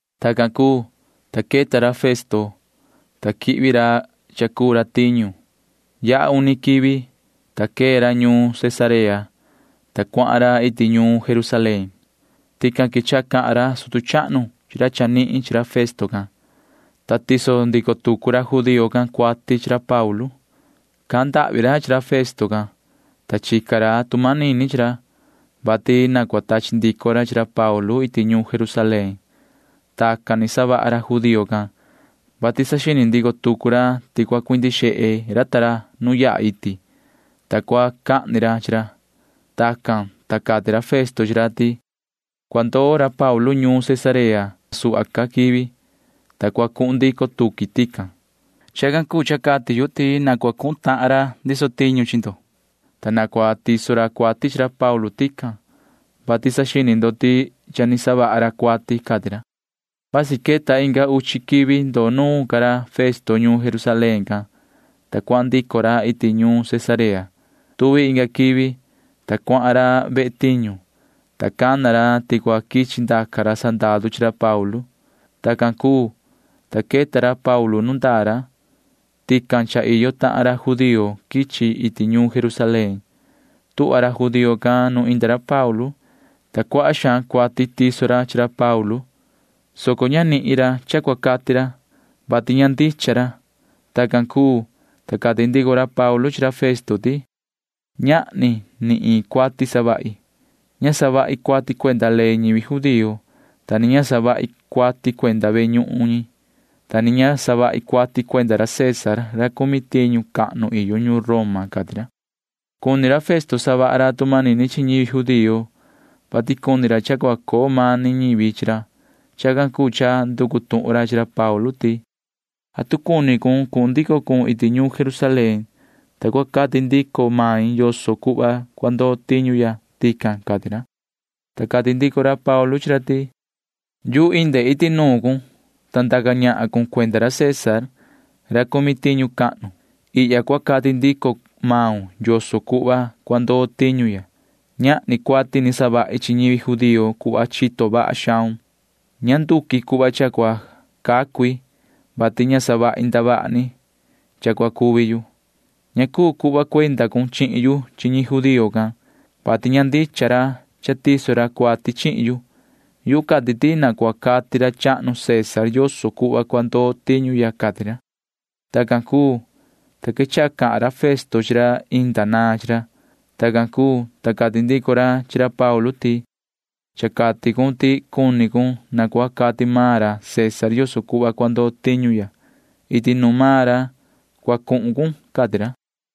Tacan cuu, ta queta ra Festo, ta quihvi ra cha cuu ra tiñu. Yaha uni quivi, ta quee ra ñuun Cesarea, ta cuahan ra iti ñuun Jerusalén. Tican quechaha cahan ra sutu chahnu chi ra chanihin chi ra Festo can, ta tiso ndico tucu ra judío can cuati chi ra Paulu. Cahan ndahvi ra chi ra Festo can, ta chica ra tu manini chi ra, vati na cua tachi ndico ra chi ra Paulu iti ñuun Jerusalén. Tacan ni savaha ra judío can, vati saxini ndico tucu ra ti cua cuindi xehe ra nu yaha iti, ta cua cahni ra chi ra. Tacan, ta cati ra Festo chi ra ti: ―Cua ndoo ra Paulu ñuun Cesarea. Inga suhva ca quivi, ta cua cuhun ndico tuqui tican. Chacan cuu cha yu cati ti na cua cuhun tahan ra ndiso tiñu ndo, ta na cua tiso ra cuati chi ra Paulu tican, vati saxini ndo ti cha ni savaha ra cuati ―cati ra. Vasi queta inga uchi quivi ndoo nuun ca ra Festo ñuun Jerusalén can, ta cuahan ndico ra iti ñuun Cesarea. Tuvi inga quivi, ta cuahan ra ve tiñu, ta cana ra ti cua quichi ndaca ra sandaru chi ra Paulu. Tacan cuu, ta queta ra Paulu nu ndaa ra. Tican cha iyo tahan ra judío quichi ra iti ñuun Jerusalén. Tuhva ra judío can nu inda ra Paulu, ta cuaha xaan cuati tiso ra chi ra Paulu, soco ña nihin ra cha cua cati ra, vati ña ndicha ra. Tacan cuu, ta cati ndico ra Paulu chi ra Festo ti: ―Ñahni ni iin cuati savahi. Ña savahi cuati cuenda ley ñivi judío, ta ni ña savahi cuati cuenda ve ñuhun cahnu ñi, ta ni ña savahi cuati cuenda ra César ra cumi tiñu cahnu iyo ñuun Roma ―cati ra. Cuni ra Festo savaha ra tu manini chi ñivi judío, vati cuni ra cha cua coo mani ñivi chi ra. Chacan cuu cha nducu tuhun ra chi ra Paulu ti: ―¿Atu cuni cun cuhun ndico cun iti ñuun Jerusalén, ta cua cati ndico main yoso cuhva cua ndoo tiñu ya tican? ―cati ra. Ta cati ndico ra Paulu chi ra ti: ―Yuhu inde iti nuun cun, ta ndaca ñahan cun cuenda ra César ra cumi tiñu cahnu. Ihya cua cati ndico maun yoso cuhva cua ndoo tiñu ya. Ñahni cuati ni savahi chi ñivi judío cuhva chito vaha xaun. Ña nduqui cuhva cha cua cacu i, vati ña savahi ndavaha ni cha cua cuvi yu. Ña cuu cuhva cuenda cun chihin yu chi ñi judío can, vati ña ndicha ra cha tiso ra cuati chihin yu. Yuhu cati ti na cua cati ra chahnu César yoso cuhva cua ndoo tiñu ya ―cati ra. Tacan cuu, ta quechaha cahan ra Festo chi ra inda naan chi ra. Tacan cuu, ta cati ndico ra chi ra Paulu ti: ―Cha cati cun ti cuni cun na cua cati maan ra César yoso cuhva cua ndoo tiñu. Iti nuun maan ra cua cuhun cun ―cati ra.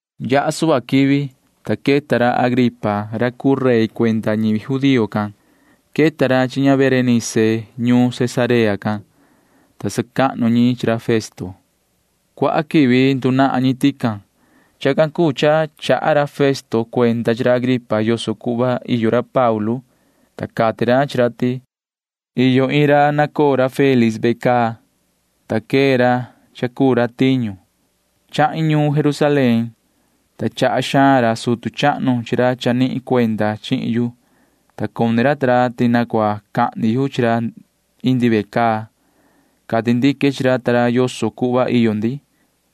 Yaha suhva quivi, ta queta ra Agripa ra cuu rey cuenda ñivi judío can. Queta ra chi ña Berenice ñuun Cesarea can, ta sacahnu ñi chi ra Festo. Cuaha quivi ndunahan ñi tican. Chacan cuu cha chaha ra Festo cuenda chi ra Agripa yoso cuhva iyo ra Paulu, ta cati ra chi ra ti: ―Iyo iin ra nacoo ra Félix ve caa, ta quee ra cha cuu ra tiñu. Chahin ñuun Jerusalén, ta chaha xaan ra sutu chahnu chi ra chanihin cuenda chihin yu, ta cuni ra ta ra ti na cua cahni yu chi ra indi ve caa. Cati ndique chi ra ta ra yoso cuhva iyo ndi,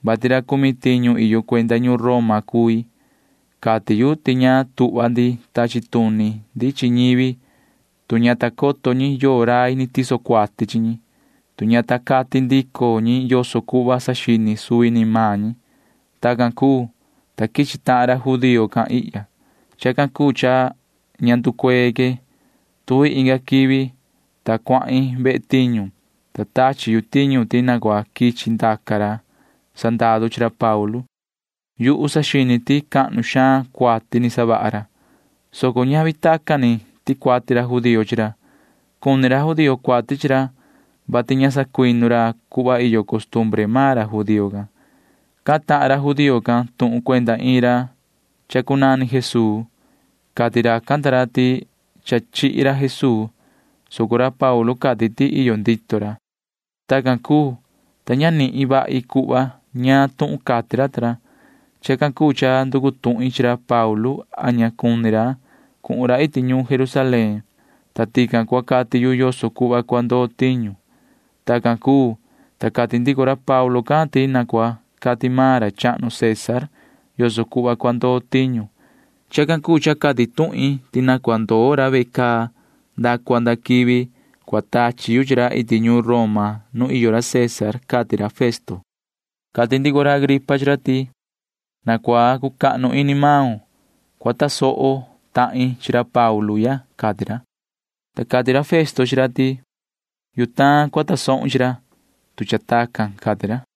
vati ra cumi tiñu iyo cuenda ñuun Roma cui. Cati yu ti ña tuhva ndi tachi tuni ndi chi ñivi, tu ña ta coto ñi yoo rai ni tiso cuati chi ñi, tu ña ta cati ndico ñi yoso cuhva saxini suvi ni maan ñi. Tacan cuu, ta quichi tahan ra judío can ihya. Chacan cuu cha ña nducuee que. Tuvi inga quivi, ta cuahin ve tiñu, ta tachi yu tiñu ti na cua quichi ndaca ra sandaru chi ra Paulu. Yuhu saxini ti cahnu xaan cuati ni savaha ra, soco ñavi tacan ni ticuati ra judío chi ra. Cuni ra judío cuati chi ra, vati ña sacuinu ra cuhva iyo costumbre maan ra judío can. Cahan tahan ra judío can tuhun cuenda iin ra cha cunani Jesuu. Cati racan ta ra ti cha chihi ra Jesuu, soco ra Paulu cati ti iyo ndito ra. Tacan cuu, ta ña nihin vahi cuhva ñaan tuhun cati ra ta ra. Chacan cuu cha nducu tuhin chi ra Paulu a ña cuni ra cuhun ra iti ñuun Jerusalén, ta tican cua cati yu yoso cuhva cua ndoo tiñu. Tacan cuu, ta cati ndico ra Paulu can ti na cua cati maan ra chahnu César yoso cuhva cua ndoo tiñu. Chacan cuu cha cati tuhin ti na cua ndoo ra ve caa nda cua nda quivi cua tachi yu chi ra iti ñuun Roma nu iyo ra César ―cati ra Festo. Cati ndico ra Agripa chi ra ti: ―Na cua cucahnu ini maun cua tasoho tahin chi ra Paulu ya ―cati ra. Ta cati ra Festo chi ra ti: ―Yutaan cua tasohun chi ra, tu cha tacan ―cati ra.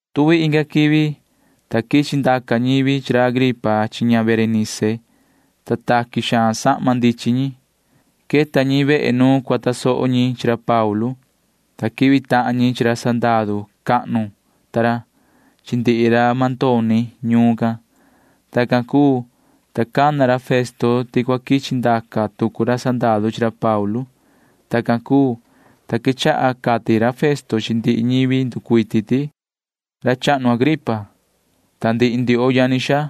Tuvi inga quivi, ta quichi ndaca ñivi chi ra Agripa chi ña Berenice, ta taqui xaan sahma ndichin ñi. Queta ñi vehe nu cua tasoho ñi chi ra Paulu, ta quihvi tahan ñi chi ra sandaru cahnu ta ra chi ndihi ra mandoni ñuun can. Tacan cuu, ta cana ra Festo ti cua quichi ndaca tucu ra sandaru chi ra Paulu. Tacan cuu, ta quechaha cati ra Festo chi ndihi ñivi nducuiti ti: ―Yoho ra chahnu Agripa, ta ndihi ndioho yani xaa,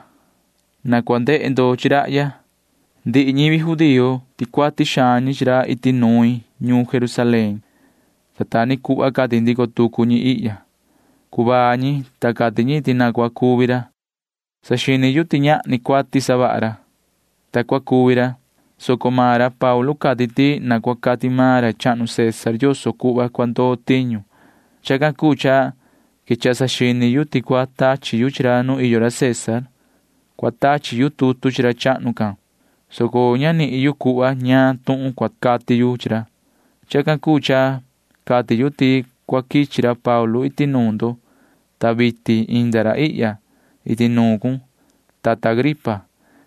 na cua ndehe ndo chi rahya. Ndihi ñivi judío ticuati xaan ñi chi ra iti nuin ñuun Jerusalén, ta ta ni cuhva cati ndico tucu ñi ihya. Cuvaa ñi, ta cati ñi ti na cua cuvi ra. Saxini yu ti ñahni cuati savaha ra, ta cua cuvi ra, soco maan ra Paulu cati ti na cua cati maan ra chahnu César yoso cuhva cua ndoo tiñu. Chacan cuu cha quechaha saxini yu ti cua tachi yu chi ra nu iyo ra César. Cua tachi yu tutu chi ra chahnu can, soco ña nihin yu cuhva ñaan tuhun cua cati yu chi ra. Chacan cuu cha cati yu ti cua quichi ra Paulu iti nuun ndo, ta vitin inda ra ihya iti nuun cun, yoho tata Agripa.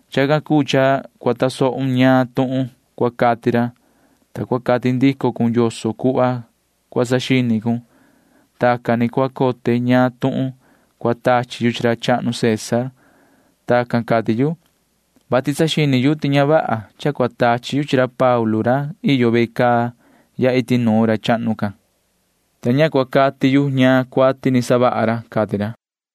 Chacan cuu cha cua tasohun ñaan tuhun cua cati ra, ta cua cati ndico cun yoso cuhva cua saxini cun. Tacan ni cua cote ñaan tuhun cua tachi yu chi ra chahnu César. Tacan cati yu, vati saxini yu ti ña vaha cha cua tachi yu chi ra Paulu ra iyo ve caa ya iti nuun ra chahnu can, ta ña cua cati yu ñaan cuati ni savaha ra ―cati ra.